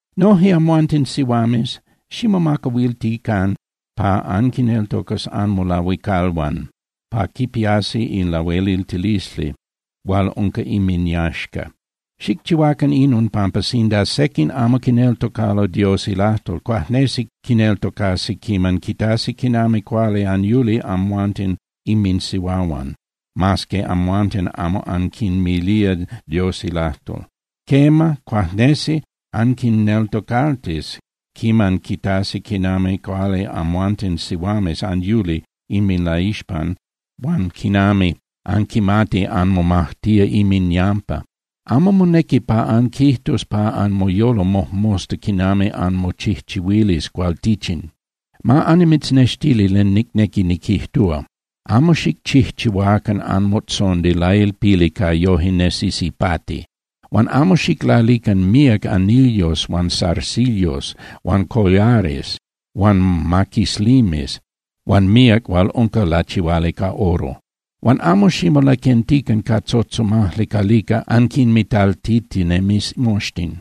Noje amhuanten sihuames, ximomacahuiltican pa anquineltocas anmolahuicalhuan pa quipiasi in lahueliltilisli hual unca inminyaxca. Xicchihuacan inon pampa sinda sequin amo quineltocalo Dios ilajtol, cuajnesi quineltocasi quiman quitasi quinami cuali anyuli amhuanten inminsihuahuan mas que amhuanten amo anquinmilía Dios ilajtol. Quema, cuajnesi anquinneltocaltis quiman quitasi quinami cuali amhuanten sihuames anyuli inminlaixpan huan quinami anquimati anmomajtía inminyampa. Amo monequi pa anquijtus pa anmoyolo mojmosta quinami anmochijchihuilis cualtichin. Ma annimitznextili len nicnequi niquijtúa: Amo xicchijchihuacan anmotzondi lailpili pa yoje nesis ipati. Huan amo xiclalican míac anillos huan zarcillos huan collares huan maquislimes huan míac hual unca lachihuali ca oro. Huan amo ximolaquentican ca tzotzomajli calica anquinmitaltitinemis moxtin.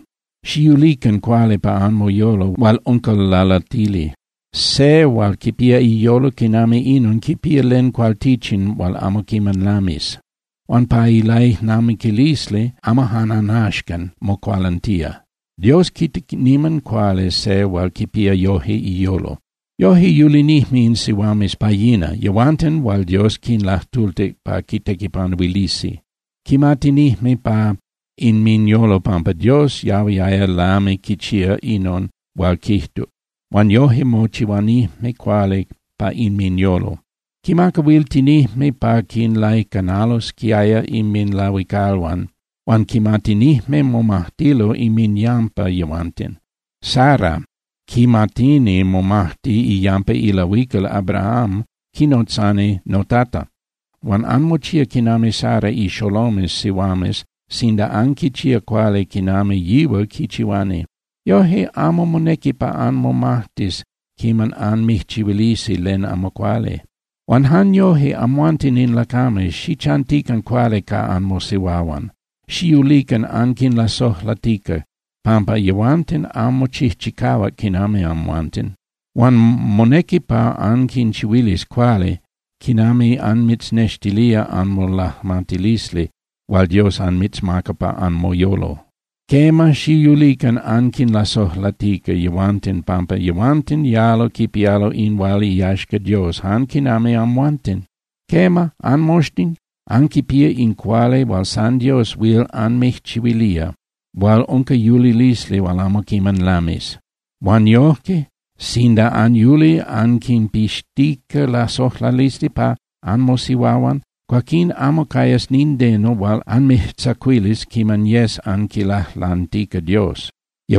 Xiyulican cuali pa anmoyolo hual unca lalatili. Se hual quipía iyolo quinami inon quipía len cualtichin hual amo quiman lamis. Huan pa ilaijnamiquilisli amo jan ajnaxcan mocualantía. Dios quita niman cuali se hual quipía yoje iyolo. Yoje yulinijme in sihuames pa yina, yehuanten hual Dios quinlajtultic pa quitequipanuilisi. Quimatinijme pa inminyolo pampa Dios yahuiaya lami quichía inon hual quijtuc, huan yoje mochihuanijme cuali pa inminyolo. Quimacahuiltinijme pa quinlaicanalosquiaya inminlahuicalhuan huan quimatinijme momajtilo inminyampa yehuanten. Sara quimatini momajti iyampa ilahuical Abraham, quinotzani “notata”. Huan anmochía quinami Sara ixolomes sihuames sinda anquichía cuali quinami yihual quichihuani. Yoje amo monequi pa anmomajtis quiman anmijchihuilisi len amo cuali. Huan jan yoje, amhuanten in lacames, xichantican cuali ca anmosihuahuan. Xiyulican anquinlasojlatica pampa yehuanten amo chijchicahuac quinami amhuanten. Huan monequi pa anquinchihuilis cuali quinami anmitznextilía anmolajmatilisli hual Dios anmitzmaca pa anmoyolo. Quema, xiyulican anquinlasojlatica yehuanten pampa yehuanten yalo quipialo in hual iyaxca Dios jan quinami amhuanten. Quema, anmoxtin anquipía in cuali hual san Dios huil anmijchihuilía hual unca yulilisli hual amo quiman lamis. Huan yojque, sinda anyuli anquinpixtica lasojlalisli pa anmosihuahuan, cuaquín amo cayas nindeno hual anmijtzacuilis quiman yes anquilajlantica Dios.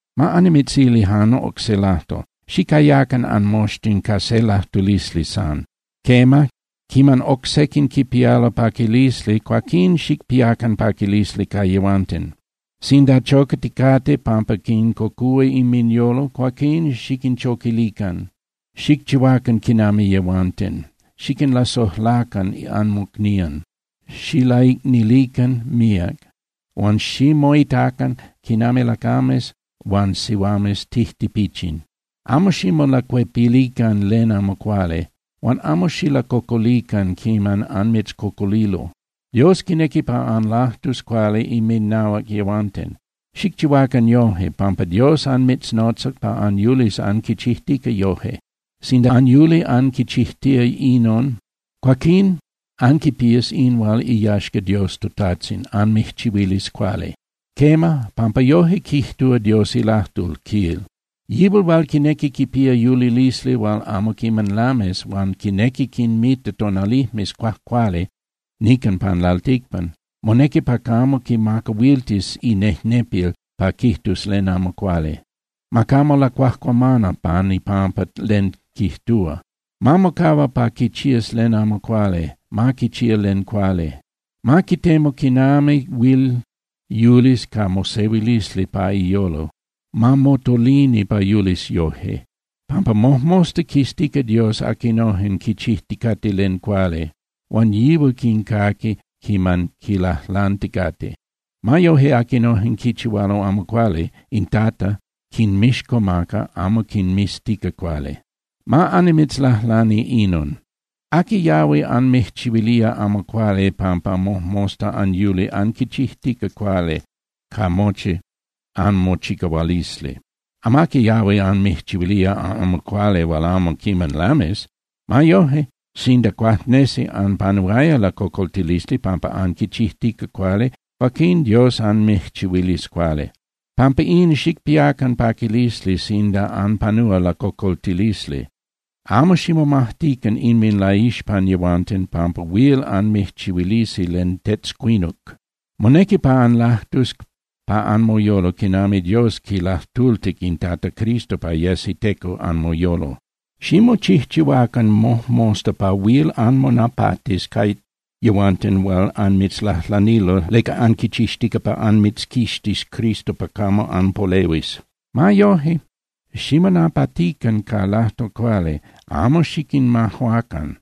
Ma annimitzili jan oc se lajtol. Xicayacan anmoxtin ca se lajtulisli san. Quema, quiman oc sequin quipialo paquilisli, cuaquín xicpiacan paquilisli ca yehuanten. Sinda chocaticate pampa quincocúa inminyolo, cuaquín xiquinchoquilican, xicchihuacan quinami yehuanten. Xiquinlasojlacan anmocnían, xilaicnilican míac, huan ximoitacan quinami lacames huan sihuames tijtipichin. Amo ximolacuepilican len amo cuali, huan amo xilacocolican quiman anmitzcocolilo. Dios quinequi pa anlajtus cuali inminahuac yehuanten. Xicchihuacan yoje, pampa Dios anmitznotzac pa anyulis anquichijtica yoje. Sinda anyuli anquichijtía inon, cuaquín anquipías in hual iyaxca Dios toTajtzin, anmijchihuilis cuali. Quema, pampa yoje quijtúa Dios ilajtol, quil: Yihual hual quinequi quipía yulilisli hual amo quiman lamis, huan quinequi quinmita tonalijmes cuajcuali nican pan lalticpan, monequi pa camo quimacahuiltis inejnepil pa quijtus len amo cuali. Ma camo lacuajcuamana pan ipampa len quijtúa. Ma mocahua pa quichías len amo cuali, ma quichía len cuali. Ma quitemu quinami huil yulis ca mosehuilisli pa iyolo, ma motolini pa yulis yoje. Pampa mojmosta quiztica Dios aquinojen quichijticate len cuali, huan yihual quincaqui quiman quilajlanticate. Ma yoje, aquinojen quichihualo amo cuali in Tata quinmixcomaca amo quinmiztica cuali. Ma annimitzlajlani inon: ¿Aqui yahui anmijchihuilía amo cuali pampa mojmosta anyuli anquichijtica cuali ca mochi anmochicahualisli? Amaqui yahui anmijchihuilía amo cuali hual amo quiman lamis. Ma yoje, sinda cuajnesi anpanuaya lacocoltilisli pampa anquichijtica cuali, cuaquín Dios anmijchihuilis cuali. Pampa in, xicpiacan paquilisli sinda anpanúa lacocoltilisli. Amo ximomajtican inminlaixpan yehuanten pampa huil anmijchihuilisi len tetzcuinuc. Monequi pa anlajtus pa anmoyolo quinami Dios quilajtultic in Tata Cristo pa yes iteco anmoyolo. Ximochijchihuacan mojmosta pa huil anmonapatis ca yehuanten hual anmitzlajlanilo leca anquichixtica pa anmitzquixtis Cristo pa camo anpolehuis. Ma yoje, ximonapatican ca lajtol cuali, amo xiquinmajuacan.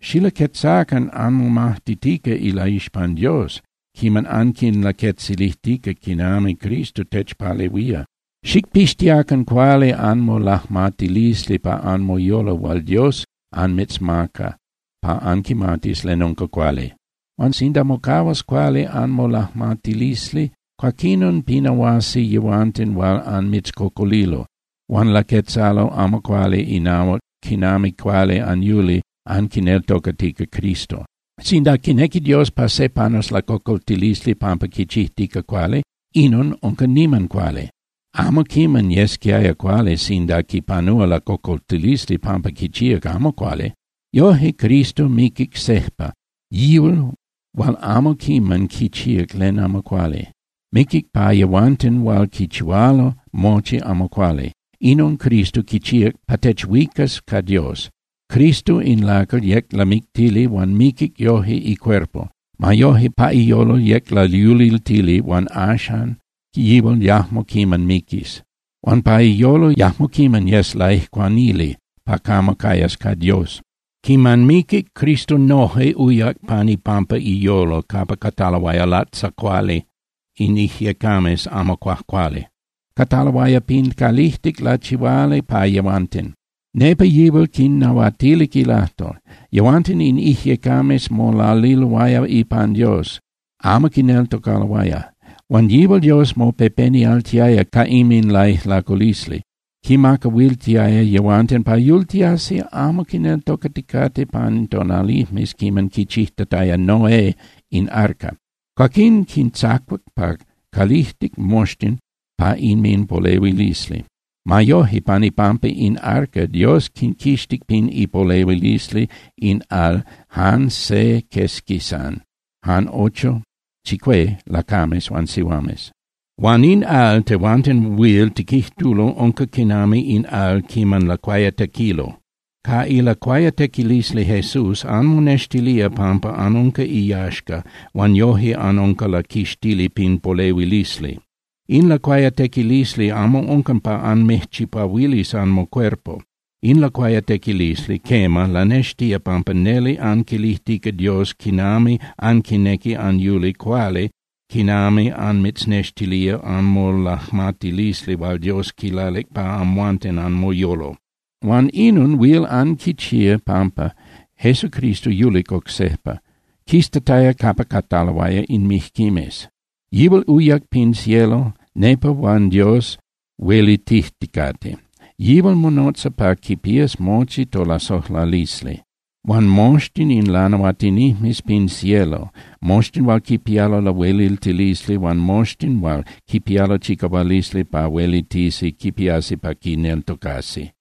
Xilaquetzacan anmomajtitica ilaixpan Dios quiman anquinlaquetzilijtica quinami Cristo techpalehuía. Xicpixtiacan cuali anmolajmatilisli pa anmoyolo hual Dios anmitzmaca pa anquimatis len unca cuali. Huan sinda mocahuas cuali anmolajmatilisli, cuaquinon pinahuasi yehuanten hual anmitzcocolilo huan laquetzalo amo cuali inahuac quinami cuali anyuli anquineltocatica Cristo. Sinda quinequi Dios pa se panus lacocoltilisli pampa quichijtica cuali, inon unca niman cuali. Amo quiman yesquiaya cuali sinda quipanúa lacocoltilisli pampa quichíac amo cuali. Yoje, Cristo miquic sejpa, yihual hual amo quiman quichíac len amo cuali. Miquic pa yehuanten hual quichihualo mochi amo cuali. Inon Cristo quichíac pa techuicas ca Dios. Cristo in lacal yec lamictili huan miquic yoje icuerpo. Ma yoje, pa iyolo yec layuliltili huan axan yihual yajmo quiman miquis. Huan pa iyolo yajmo quiman yes laijcuanili pa camo cayas ca Dios. Quiman miquic, Cristo noje uyac pan ipampa iyolo capa cataloaya latzacuali in ijyecames amo cuajcuali, cataloaya pin calijtic lachihuali pa yehuanten. Nepa yihual quinnahuatilic ilajtol. Yehuanten in ijyecames molaliloaya ipan Dios, amo quineltocaloaya. Huan yihual Dios mopepenialtiaya ca inminlaijlaculisli, quinmacahuiltiaya yehuanten pa yultiasi amo quineltocaticate pan tonalijmes quiman quichijtataya Noé in arca. Cuaquín quintzacuac pa calijtic moxtin pa inminpolehuilisli. Ma yoje, pan ipampa in arca Dios quinquixtic pin ipolehuilisli in al jan se quesqui san, jan ocho (chicué) lacames huan sihuames. Huan in al tehuanten huil tiquijtulo unca quinami in al quiman lacuayatequilo. Ca ilacuayatequilisli Jesús anmonextilía pampa anunca iyaxca huan yoje anunca laquixtili pin polehuilisli. In lacuayatequilisli amo unca pa anmijchipahuilis anmocuerpo. In lacuayatequilisli, quema, lanextía pampa neli anquilijtica Dios quinami anquinequi anyuli cuali quinami anmitznextilía anmolajmatilisli hual Dios quilalic pa amhuanten anmoyolo. Huan inon huil anquichía pampa Jesucristo yulic oc sejpa, quistataya capa cataloaya in mijquimes. Yihual uyac pin cielo, nepa huan Dios huelitijticate. Yihual monotza pa quipías mochi tolasojlalisli. Huan moxtin in lanahuatinijmes pin cielo, moxtin hual quipialo lahueliltilisli huan moxtin hual quipialo chicahualisli pa huelitisi quipiasi pa quineltocasi.